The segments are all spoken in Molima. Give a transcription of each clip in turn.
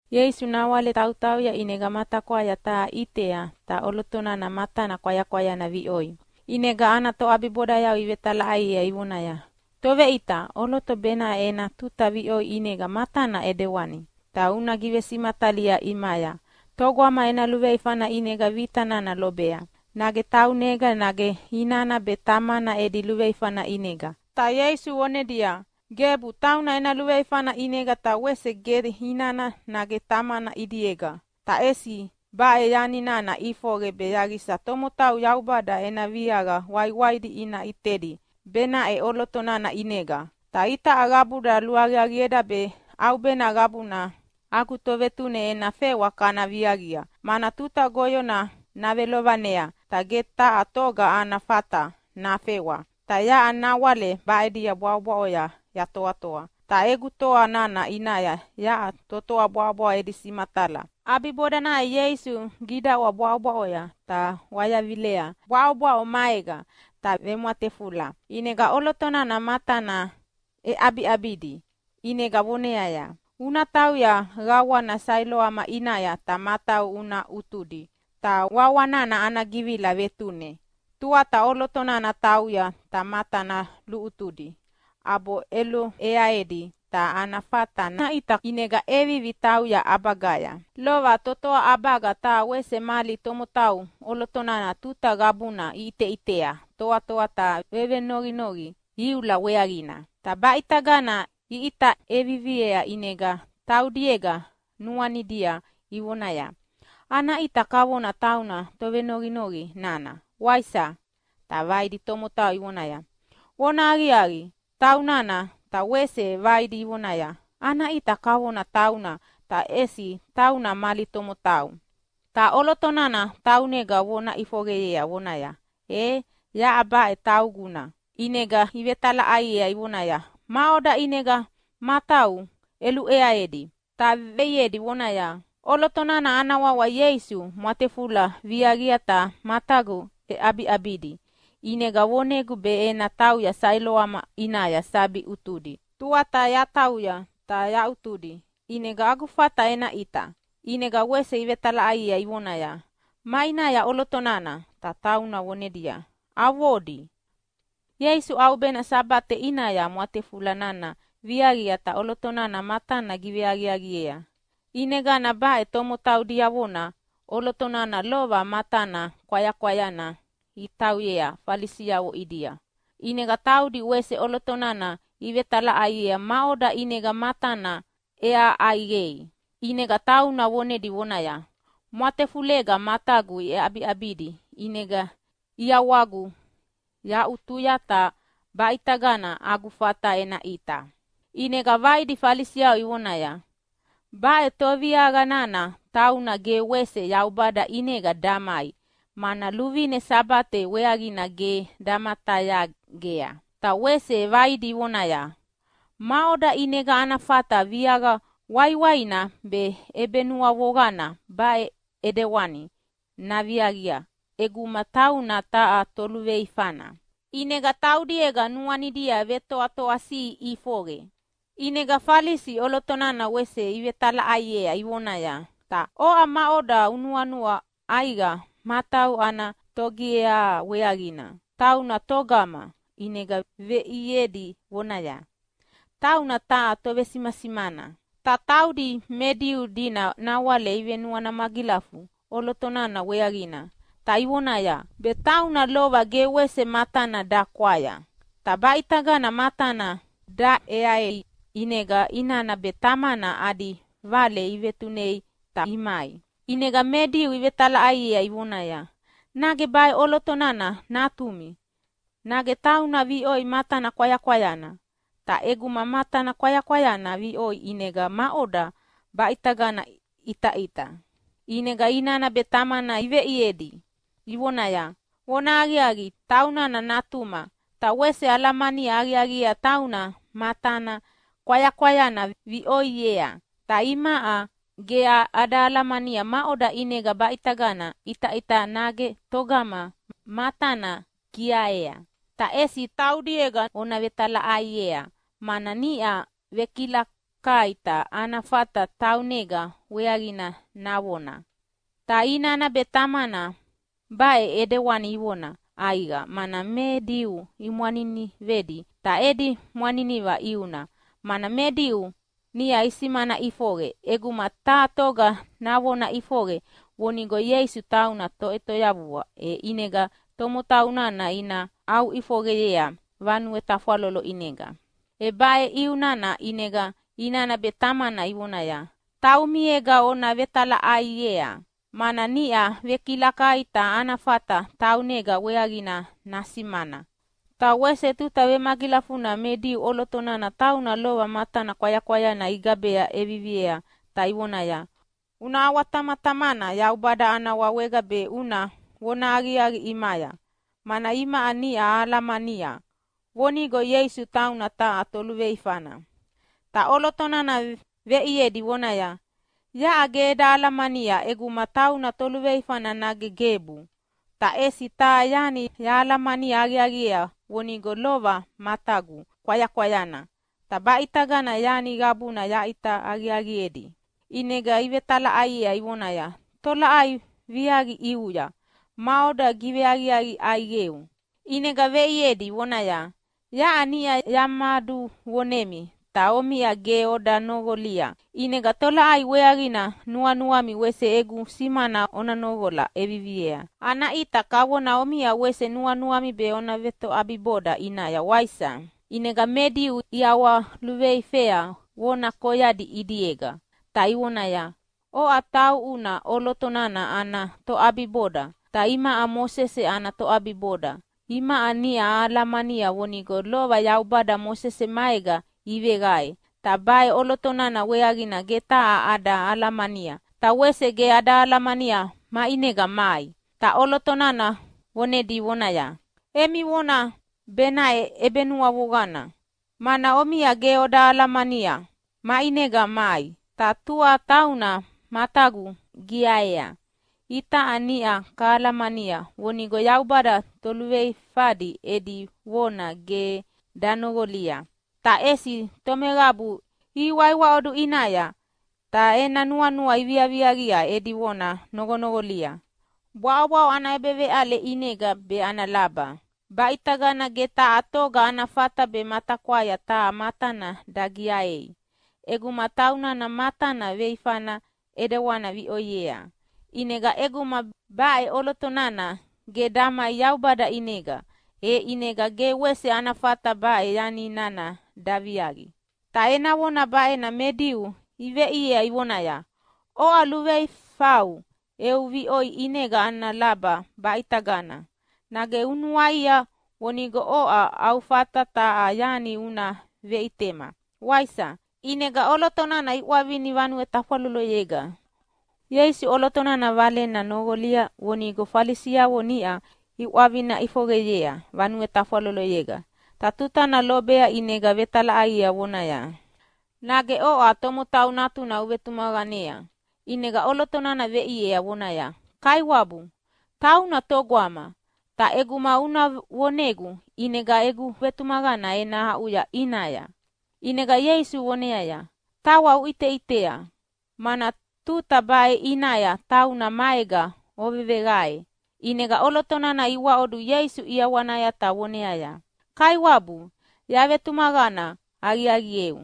Ieisu nawale tautauya ʼinega matakwaya taha ʼitea. Ta ʼoloto nana matana kwayakwayana viʼoi. ʼInega ana toʼabibodayavo ivetalaʼaiea ivonaya, “Toveʼita, ʼoloto baʼena ena tuta viʼoi ʼinega matana ʼedewani. Ta una givesimatalia ʼimaya, togama ena luveifana ʼinega vita nana lobea, nage taunega, nage inana be tamana edi luveifana ʼinega?” Ta Ieisu vonedia, “Gebu tauna ena luveifana ʼinega ta wese ge inana nage tamana ʼidiega. Ta ʼesi baʼe yani nana ʼifoqe be yaqisa tomotau Yaubada ena viaqa waiwaidi ina ʼitedi benaʼe ʼoloto nana ʼinega. Itaʼa qabuda luaqiaqieda be ʼaubena qabuna agu Tovetune ena fewa kana viaqia, mana tuta goyona navelovanea ta ge taha toga ana fata nafewa. Ta yaʼa nawale baʼade bwaʼobwaʼoya yatoatoa, ta egu toa nana ʼinaya yaʼa totoa bwaʼobwaʼo edi simatala.” ʼAbibodanaya Ieisu gidaʼwa bwaʼobwaʼoya, ta wayavilea bwaʼobwaʼo maega ta vemwatefula, ʼinega ʼoloto nana matana ʼeʼabiʼabidi. ʼInega voneaya, “Una tauya qawana Sailoama ʼinaya ta matau una ʼutudi!” (Ta wawa nana ana givila Vetune). Tuata ʼoloto nana tauya ta matana luʼutudi, ʼabo ʼeluʼeaedi, ta ana fata naʼita, ʼinega ʼevivi tauya ʼabagaya. Lova totoa ʼabaga ta wese mali tomotau ʼoloto nana tuta qabuna iʼiteʼitea toatoa ta vevenoqinoqi iula weaqina. Ta baʼitagana iʼita ʼeviviea ʼinega taudiega nuanidia ivonaya, “Ana ʼita kavona tauna tovenoqinoqi nana, waisa?” Ta vaidi tomotau ivonaya, “Vonahaqiaqi, taunana!” Ta wese vaidi ivonaya, “Ana ʼita kavona tauna, ta ʼesi tauna mali tomotau!” Ta ʼoloto nana taunega vona ʼifoqeyea, vonaya, “E, yaʼa baʼe tauguna!” ʼInega ivetalaʼaiea ivonaya, “Maʼoda ʼinega matau ʼeluʼeaedi?” Ta veʼiedi vonaya, “ʼOloto nana ana wawa Ieisu mwatefula viaqia ta matagu ʼeʼabiʼabidi. ʼInega vonegu be ena tauya Sailoama ʼinaya sabi ʼutudi. Tuata yatauya ta yaʼutudi, ʼinega agu fata ena ʼita.” ʼInega wese ivetalaʼaiea ivonaya, “Maʼinaya ʼoloto nana?” Ta tauna vonedia, “Avodi.” Ieisu ʼaubena Sabate ʼinaya mwatefula nana viaqia ta ʼoloto nana matana giveaqiaqiea. ʼInegana baʼe tomotau diavona ʼoloto nana lova matana kwayakwayana itauyea Falisiavo ʼidia. ʼInega taudi wese ʼoloto nana ivetalaʼaiea maʼoda ʼinega matana ʼeaha ʼaiqei. ʼInega tauna vonedi vonaya, “Mwatefulega matagu ʼeʼabiʼabidi, ʼinega ʼiawagu yaʼutuya, ta baʼitagana agu fata ena ʼita.” ʼInega vaidi Falisi ivonaya, “Baʼe toviaqa nana tauna ge wese Yaubada ʼinega damai, mana luvine Sabate weaqina ge damatayagea!” Ta wese vaidi ivonaya, “Maʼoda ʼinega ana fata viaqa waiwaina be ʼebenuavoqana baʼe ʼidewani naviaqia ʼeguma tauna taha toluveifana?” ʼInega taudiega nuanidia vetoatoasiʼi ʼifoqe. ʼInega Falisi ʼoloto nana wese ivetalaʼaiea ivonaya, “Ta oʼa maʼoda unuanua ʼaiqa matau ana togiaha weaqina? Tauna togama?” ʼInega veʼiedi vonaya, “Tauna taha tovesimasimana.” Ta taudi me Diu dina nawale ivenuana magilafu ʼoloto nana weaqina, ta ivonaya be tauna lova ge wese matana dakwaya ta baʼitagana matana daʼeaei, ʼinega inana be tamana adi vale ivetunea ta imai. ʼInega me Diu ivetalaʼaiedi ivonaya, “Nage baʼe ʼoloto nana natumi? Nage tauna viʼoi matana kwayakwayana? Ta ʼeguma matana kwayakwayana viʼoi, ʼinega maʼodana baʼitagana ʼitaʼita?” ʼInega inana be tamana iveʼiedi ivonaya, “Vonahaqiaqi, taunana natuma, ta wese ahalamani aqiaqiea tauna matana kwayakwayana viʼoiea. Ta imaʼa ge ada alamania maʼoda ʼinega baʼitagana ʼitaʼita nage togama matana giaea. Ta ʼesi taumiega ona vetalaʼaiea, mana niʼa vekilakai ta ana fata taunega weaqina navona.” Ta inana be tamana baʼe ʼidewani ivona ʼaiqa mana me Diu imwaninivedi. Ta edi mwaniniva ʼiuna, mana me Diu niʼa isimana ʼifoqe ʼeguma taha toga navona ʼifoqe vonigo Ieisu tauna Toʼetoyavua, e ʼinega tomotau nana ina aʼuʼifoqeyea vanue tafwalolo ʼinega. E baʼe ʼiu nana ʼinega inana be tamana ivonaya, “Taumiega ona vetalaʼaiea, mana niʼa vekilakai ta ana fata taunega weaqina nasimana.” Ta wese tuta vemagilafuna me Diu ʼoloto nana tauna lova matana kwayakwayana igaba ʼeviviea ta ivoneaya, “Una ʼawatamatamana Yaubada ana wawega be una vonahaqiaqi ʼimaya. Mana imaʼa niʼa ahalamania vonigo Ieisu tauna taha toluveifana.” Ta ʼoloto nana veʼiedi vonaya, “Yaʼa ge eda alamania ʼeguma tauna toluveifana nage gebu. Ta ʼesi taha yani yahalamani aqiaqiea vonigo lova matagu kwayakwayana, ta baʼitagana yani qabuna yaʼita aqiaqiedi!” ʼInega ivetalaʼaiea ivonaya, “Tolaʼai viaqi ʼiuya? Maʼoda giveaqiaqi ʼaiqeu?” ʼInega veʼiedi vonaya, “Yaʼa niʼa yamaduvonemi ta omiʼa ge oda noqolia. ʼInega tolaʼai weaqina nuanuami wese egu simana ona noqola ʼeviviei? Ana ʼita kavona omiʼa wese nuanuami be ona vetoʼabiboda ʼinaya, waisa?” ʼInega me Diu iʼawaluveifea vona koyadi ʼidiega, ta ivonaya, “Oʼa tauʼuna ʼoloto nana ana toʼabiboda! Ta imaʼa Mosese ana toʼabiboda! Imaʼa niʼa ahalamania vonigo lova Yaubada Mosese maega iveqae, ta baʼe ʼoloto nana weaqina ge taha ada alamania, ta wese ge ada alamania maʼinega mai.” Ta ʼoloto nana vonedi vonaya, “Emi vona benaʼe ʼebenuavoqana, mana omiʼa ge oda alamania maʼinega mai, ta tua tauna matagu giaea. Itaʼa niʼa kahalamania vonigo Yaubada toluveifadi edi vona ge danoqolia. Ta ʼesi tomeqabu ihiwaiwaʼodu ʼinaya ta ena nuanua iviaviaqia edi vona noqonoqolia. Bwaʼobwaʼo ana ʼebeveʼale ʼinega be ana laba baʼitagana ge taha toga ana fata be matakwaya taha matana dagiaei ʼeguma taunana matana veifana ʼidewani viʼoiea. ʼInega ʼeguma baʼe ʼoloto nana ge damai Yaubada ʼinega, e ʼinega ge wese ana fata baʼe yani nana daviaqi!” Ta ena vona baʼena me Diu iveʼiea ivonaya, “Oʼa luluveifau eu viʼoi ʼinega ana laba baʼitagana! Nage unuaia vonigo oʼa au fata taha yani una veʼitema, waisa?” ʼInega ʼoloto nana iʼwavinia vanue tafwaloloyega. Ieisu ʼoloto nana valena noqolia vonigo Falisiavo niʼa iʼwavina ʼifoqeyea vanue tafwaloloyega. Ta tuta nana lobea ʼinega vetalaʼaiea vonaya, “Nage oʼa Tomotau Natuna uvetumaqanea?” ʼInega ʼoloto nana veʼiea vonaya, “Kaiwabu, tauna togama? Ta ʼeguma una vonegu ʼinega egu vetumaqana ena aʼuya ʼinaya!” ʼInega Ieisu voneaya, “Tawa uʼiteʼitea, mana tuta baʼe ʼinaya tauna maega oveveqae.” ʼInega ʼoloto nana iwaʼodu Ieisu ʼiawanaya ta voneaya, “Kaiwabu, yavetumaqana aqiaqieu!”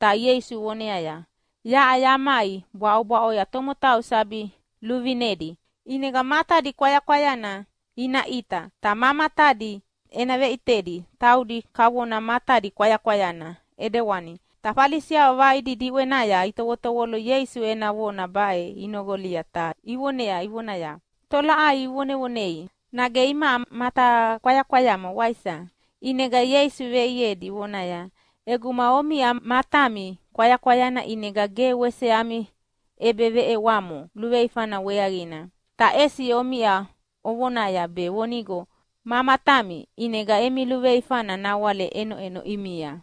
Ta Ieisu voneaya, “Yaʼa yamai bwaʼobwaʼoya tomotau sabi luvinedi. ʼInega matadi kwayakwayana ina ʼita, ta ma matadi ena veʼitedi taudi kavona matadi kwayakwayana ʼidewani.” Ta Falisiavo vaidi diʼwenaya itovotovolo Ieisu ena vona baʼe inoqolia ta ivonea ivonaya, “Tolaʼai uvonevonei, nage imaʼa matakwayakwayama, waisa?” ʼInega Ieisu veʼiedi vonaya, “ʼEguma omiʼa matami kwayakwayana ʼinega ge wese ami ʼebeveʼewamo luveifana weaqina. Ta ʼesi omiʼa ovonaya be vonigo ma matami, ʼinega emi luveifana nawale ʼenoʼeno ʼimia.”